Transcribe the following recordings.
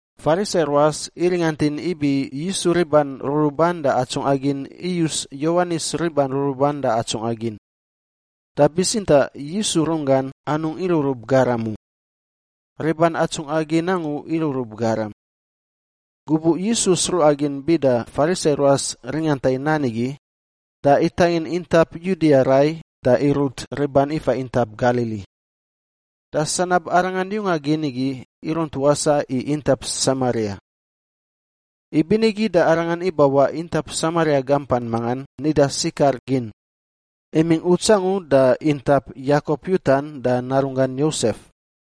Farisai ruas iringantin ibi Yisu riban ruruban da atsungꞌa gin iyus Yowanis riban ruruban da atsungꞌa gin. Da bitsintaꞌ Yisu runggan anungꞌ irurub garam u; riban atsungꞌa gin angu irurub garam. Gubuꞌ Yisu sruꞌa gin bida Farisai ruas ringanta i nan igi, da itangin intap Yudia rai da irut riban ifa intap Galili. Da sanab Arangan yunga gin igi irunt wasaꞌ i intap Samaria. Ibinigi da Arangan ibawaꞌ intap Samaria gampan mangan nida Sikar gin, imingꞌ uts angu da intap Yakop yutan da narunggan Yosef.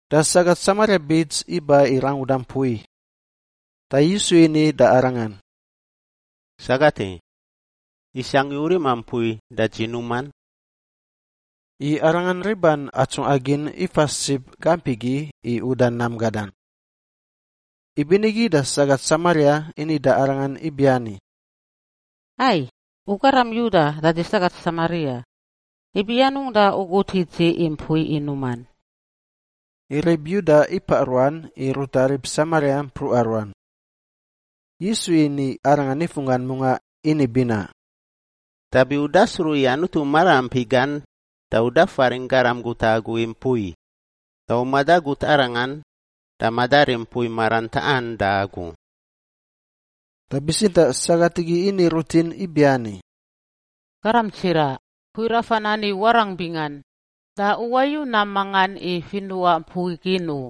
Da sagat Samaria bits iba i ranguda mpui, da Yisu ini da arangan, “Sagat i, isangꞌ i u rima mpui da dzi numan?” I Arangan riban atsungꞌa gin ifa sib gamp igi i uda nam gadan. Ibinigi da sagat Samaria ini da Arangan ibiani, “Ai! U garam Yuda da dzi sagat Samaria. Ibi anungꞌ da u gut i dzi i mpui i numan?” (I rib Yuda ipaꞌ ruan i ruta rib Samaria mpruꞌa ruan.) Yisu ini arangan nifunggan mungaꞌ ini binaꞌ, “Dabi u dasruꞌ i Anutu maraampi gan da u dafaringꞌ garam guta i agu i mpui, da u madagut Arangan da madarim mpui maran taꞌan da agu.” Da bitsintaꞌ sagat igi ini rutin ibiani, “Garam tsiraꞌ, mpui rafan ani warangꞌ bingan, da u wayu nam mangan i finuꞌa mpui gin u!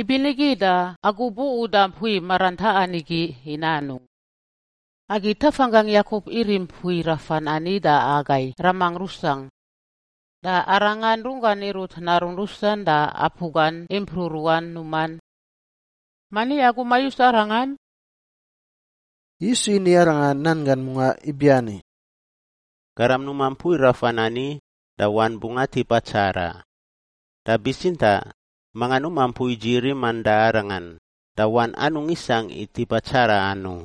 Ibinigi da agu bu-uda mpui maran taꞌan igi i nanungꞌ? Agi tafanggangꞌ Yakop irim mpui rafan ani da agai ramangꞌ rusangꞌ, da arangan runggan irut narun rusan da apu gan impruꞌ ruan numan. Mani agu mayus arangan?” Yisu ini arangan nan gan mungaꞌ ibiani, “Garam numa mpui rafan ani da wan bungꞌ atip atsaraꞌ, da bitsintaꞌ manga numa mpui dzi riman da arangan, da wan anungꞌ isangꞌ i tipa tsaraꞌan u.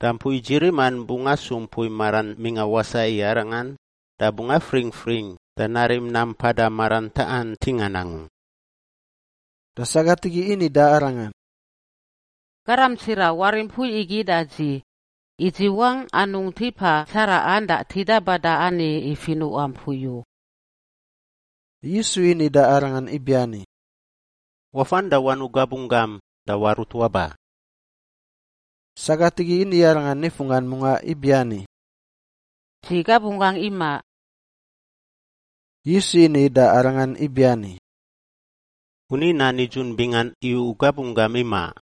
Da mpui dzi riman bungꞌ asu mpui maran mingꞌa wasaꞌ i arangan da bungꞌ afringfring da narim nam mpada maran taꞌan ntingan angu.” Da sagat igi ini da Arangan, “Garam tsiraꞌ! Warim mpui igi da dzi, i dzi wangꞌ anungꞌ tipa tsaraꞌan da tida bada ani i finuꞌa mpui u.” Yisu ini da arangan ibiani, “Wafan da wanuꞌ gabunggam da warut waba.” Sagat igi ini Arangan nifunggan mungaꞌ ibiani, “Dzi gabunggangꞌ imaꞌ.” Yisu ini da arangan ibiani, “U ni nan nidzun bingan i u gabunggam imaꞌ.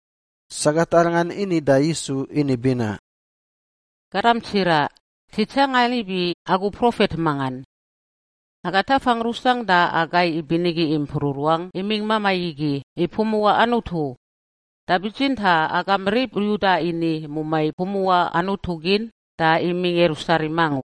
Sagat arangan ini da Yisu ini binaꞌ, “Garam tsiraꞌ, dzi tsangan ibi agu profet mangan. Aga tafangꞌ rusangꞌ da agai ibinigi impruꞌ ruangꞌ imingꞌ mamai igi i pumuꞌa Anutu, da bitsintaꞌ agam rib Yuda ini mumai pumuꞌa Anutu gin da imingꞌ Yerusalem angu.”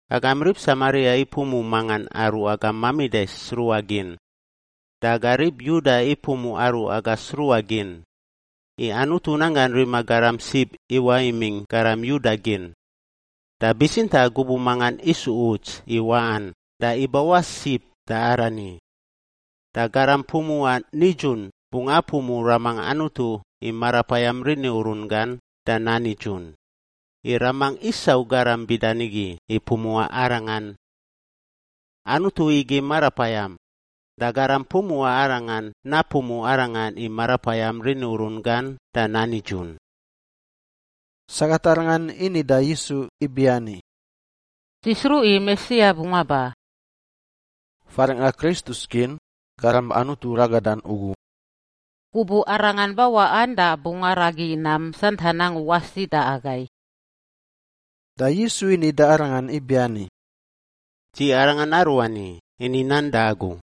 Agam rib Samaria ipumuꞌ mangan aru agam mamida i sruꞌa gin, da aga rib Yuda ipumuꞌ aru aga sruꞌa gin, i Anutu nanggan rima garam sib iwaꞌ imingꞌ garam Yuda gin. Da bitsintaꞌ gubuꞌ mangan isu uts i waꞌan da ibawaꞌ sib da arani, da garam pumuꞌa nidzun bungꞌ apumuꞌ Ramangꞌ Anutu i Marapayam rini urun gan da nan nidzun, i Ramangꞌ isau garam bida nigi i pumuꞌa Arangan. Anutu igi Marapayam, da garam pumuꞌa Arangan napumuꞌ Arangan i Marapayam rini urun gan da nan nidzun.” Sagat arangan ini da Yisu ibiani, “Dzi sruꞌ i Mesia bungꞌ aba” (faringꞌa Kristus gin, Garam Anutu Ragadan ugu). “Gubuꞌ Arangan bawaꞌan, da bungꞌ aragi nam santan angu wasi da agai.” Da Yisu ini da arangan ibiani, “Dzi Arangan Aruani ini nan da agu.”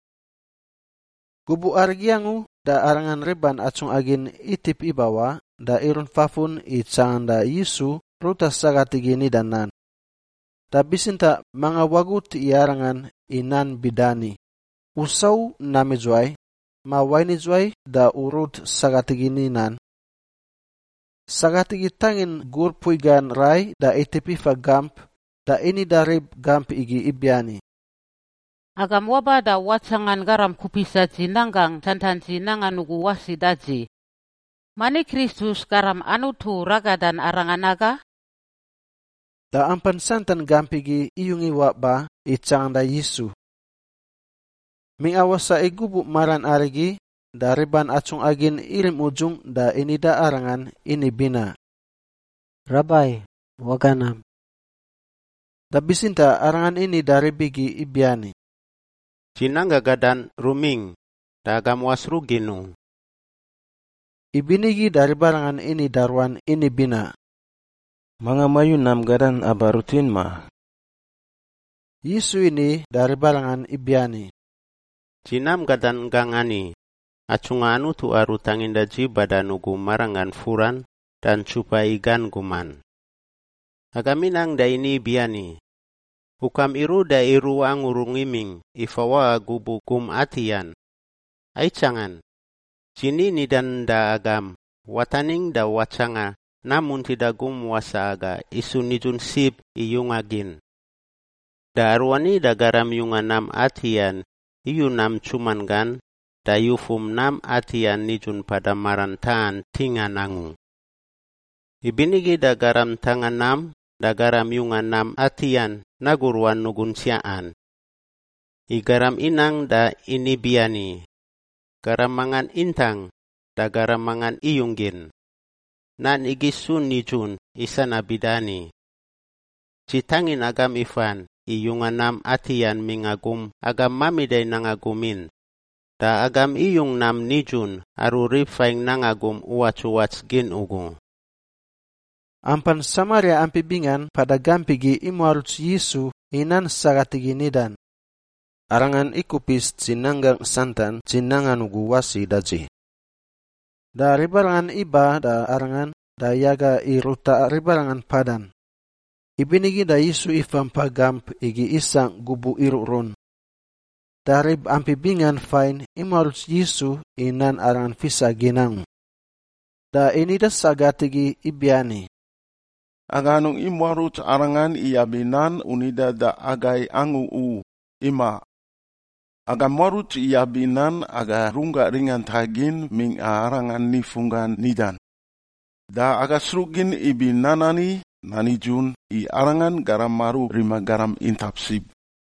Gubuꞌ arigi angu da Arangan riban atsungꞌa gin itip ibawaꞌ da irunt fafun i tsanganda Yisu ruta sagat igi nida nan. Da bitsintaꞌ manga wagut i Arangan i nan bida ani, “U sau nam idzuwai?” ma “Wain idzuwai da u rut sagat igi ini nan?” Sagat igi itangin gur mpui gan rai da itip ifa gamp da ini da rib gamp igi ibiani, “Agam waba da watsangan garam kupisa dzi nanggangꞌ santan dzi nangan ugu wasi da dzi! Mani Kristus, Garam Anutu ragadan, arangan aga?” Da ampan santan gamp igi iyung iwaꞌ ba i tsanganda Yisu. Mingꞌa wasaꞌ i gubuꞌ maran arigi, da riban atsungꞌa gin irim udzungꞌ da ini da Arangan ini binaꞌ, “Rabai, waga nam.” Da bitsintaꞌ Arangan ini da rib igi ibiani, “Dzi nanggangꞌ gadan rumingꞌ, da agam wasruꞌ gin u.” Ibinigi da ribarangan ini da ruan ini binaꞌ, “Manga mayu nam gadan aba rutin, ma?” Yisu ini da ribarangan ibiani, “Dzi nam gadan gangꞌ ani: atsungꞌa Anutu aru tanginda dzi badan ugu maranggan furan da ntsupa i gan guman. Agam inang da ini ibiani, ‘Ukam iruꞌ da iruꞌ angu rungꞌ imingꞌ i fawaꞌa gubuꞌ gum atiꞌan.’ Aitsangan! Dzi ni nidan da agam, wataningꞌ da watsanga, nam muntida gum wasaꞌ aga isu nidzun sib i yunga gin. Da aruani da garam yunga nam atiꞌan iyu nam ntsuman gan da yufum nam atiꞌan nidzun mpada maran taꞌan ntingan angu. Ibinigi da garam ntanga nam da garam yunga nam atiꞌan nagu ruan nugun tsiaꞌan. I garam inang da ini biani, ‘Garam mangan intang da garam mangan iyung gin.’ Nan igi isu nidzun i sanab bida ani. Dzi tangin agam ifan i yunga nam atiꞌan mingꞌa gum agam mamida nanga gum in, da agam iyung nam nidzun aru rib fain nanga gum uwatsuwats gin ugu.” Ampan Samaria ampi bingan mpada gamp igi imuaruts Yisu i nan sagat igi nidan, “Arangan ikupis dzi nanggangꞌ santan dzi nangan ugu wasi da dzi.” Da ribarangan iba da Arangan da yaga i ruta ribarangan mpadan, ibinigi da Yisu ifa mpa gamp igi isangꞌ gubuꞌ iruꞌrun. Da rib ampi bingan fain imuaruts Yisu i nan Arangan fisa gin angu. Da ini da sagat igi ibiani, “Aga anungꞌ imuaruts Arangan iyab i nan u nidan da agai angu u, imaꞌ. Aga muaruts iyab i nan aga runggangꞌ ringanta gin mingꞌa Arangan nifunggan nidan, da aga sruꞌgin ibi nan ani nan nidzun i Arangan garam aru rima garam intap sib.”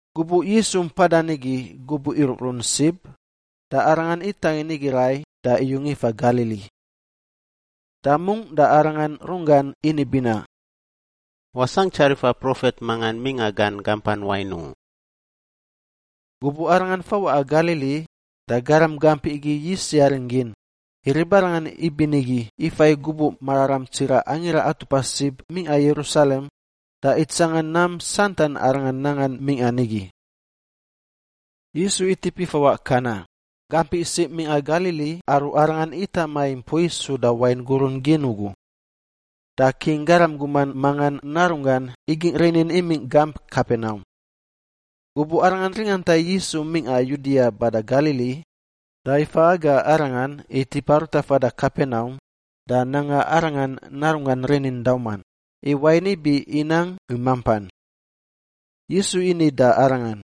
Gubuꞌ Yisu mpadan nigi gubuꞌ iruꞌrun sib, da Arangan itangin nigi rai da iyung ifa Galili. Da mungꞌ da Arangan runggan ini binaꞌ, “Wasangꞌ tsarifa profet mangan mingꞌa gan gampan wain u.” Gubuꞌ Arangan fawaꞌa Galili, da garam gamp igi yis yaring gin, i ribarangan ibinigi ifa i gubuꞌ mararam tsiraꞌ Angira Atupa Sib mingꞌa Yerusalem da itsangan nam santan Arangan nangan mingꞌa nigi. Yisu itip ifawaꞌ Kana, gamp isiꞌ mingꞌa Galili aru Arangan itama i mpui suda wain gurun gin ugu. Da king garam guman mangan narunggan igingꞌ rinin imingꞌ gamp Kapenaum. Gubuꞌ arangan ringanta i Yisu mingꞌa Yudia bada Galili, da ifa aga Arangan i tipa ruta fada Kapenaum da nanga arangan narunggan rinin dauman, i wain ibi inang i mampan. Yisu ini da arangan,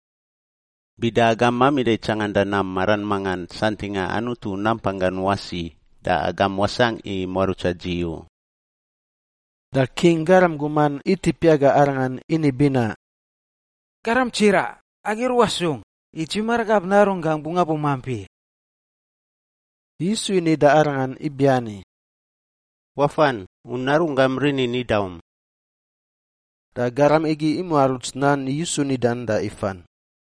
“Bida agam mamida i tsanganda nam maran mangan santingꞌa Anutu nampanggan wasi, da agam wasangꞌ muarutsa dzi u.” Da king garam guman itip yaga Arangan ini binaꞌ, “Garam tsira! Agi ruꞌa sung, i dzi maragab narunggangꞌ bungꞌ abumamp i!” Yisu ini da arangan ibiani, “Wafan! U narunggam rinin idaum.” Da garam igi imuaruts nan Yisu nidan da ifan.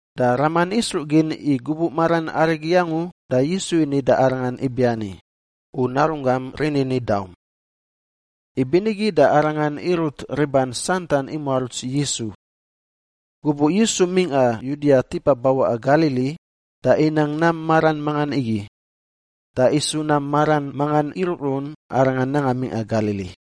Da raman isruꞌ gin i gubuꞌ maran arigi angu da Yisu ini da arangan ibiani, “U narunggam rinin idaum.” Ibinigi da arangan irut riban santan imuaruts Yisu. Gubuꞌ Yisu mingꞌa Yudia tipa bawaꞌa Galili, da inang nam maran mangan igi. Da isu nam maran mangan iruꞌrun Arangan nanga mingꞌa Galili.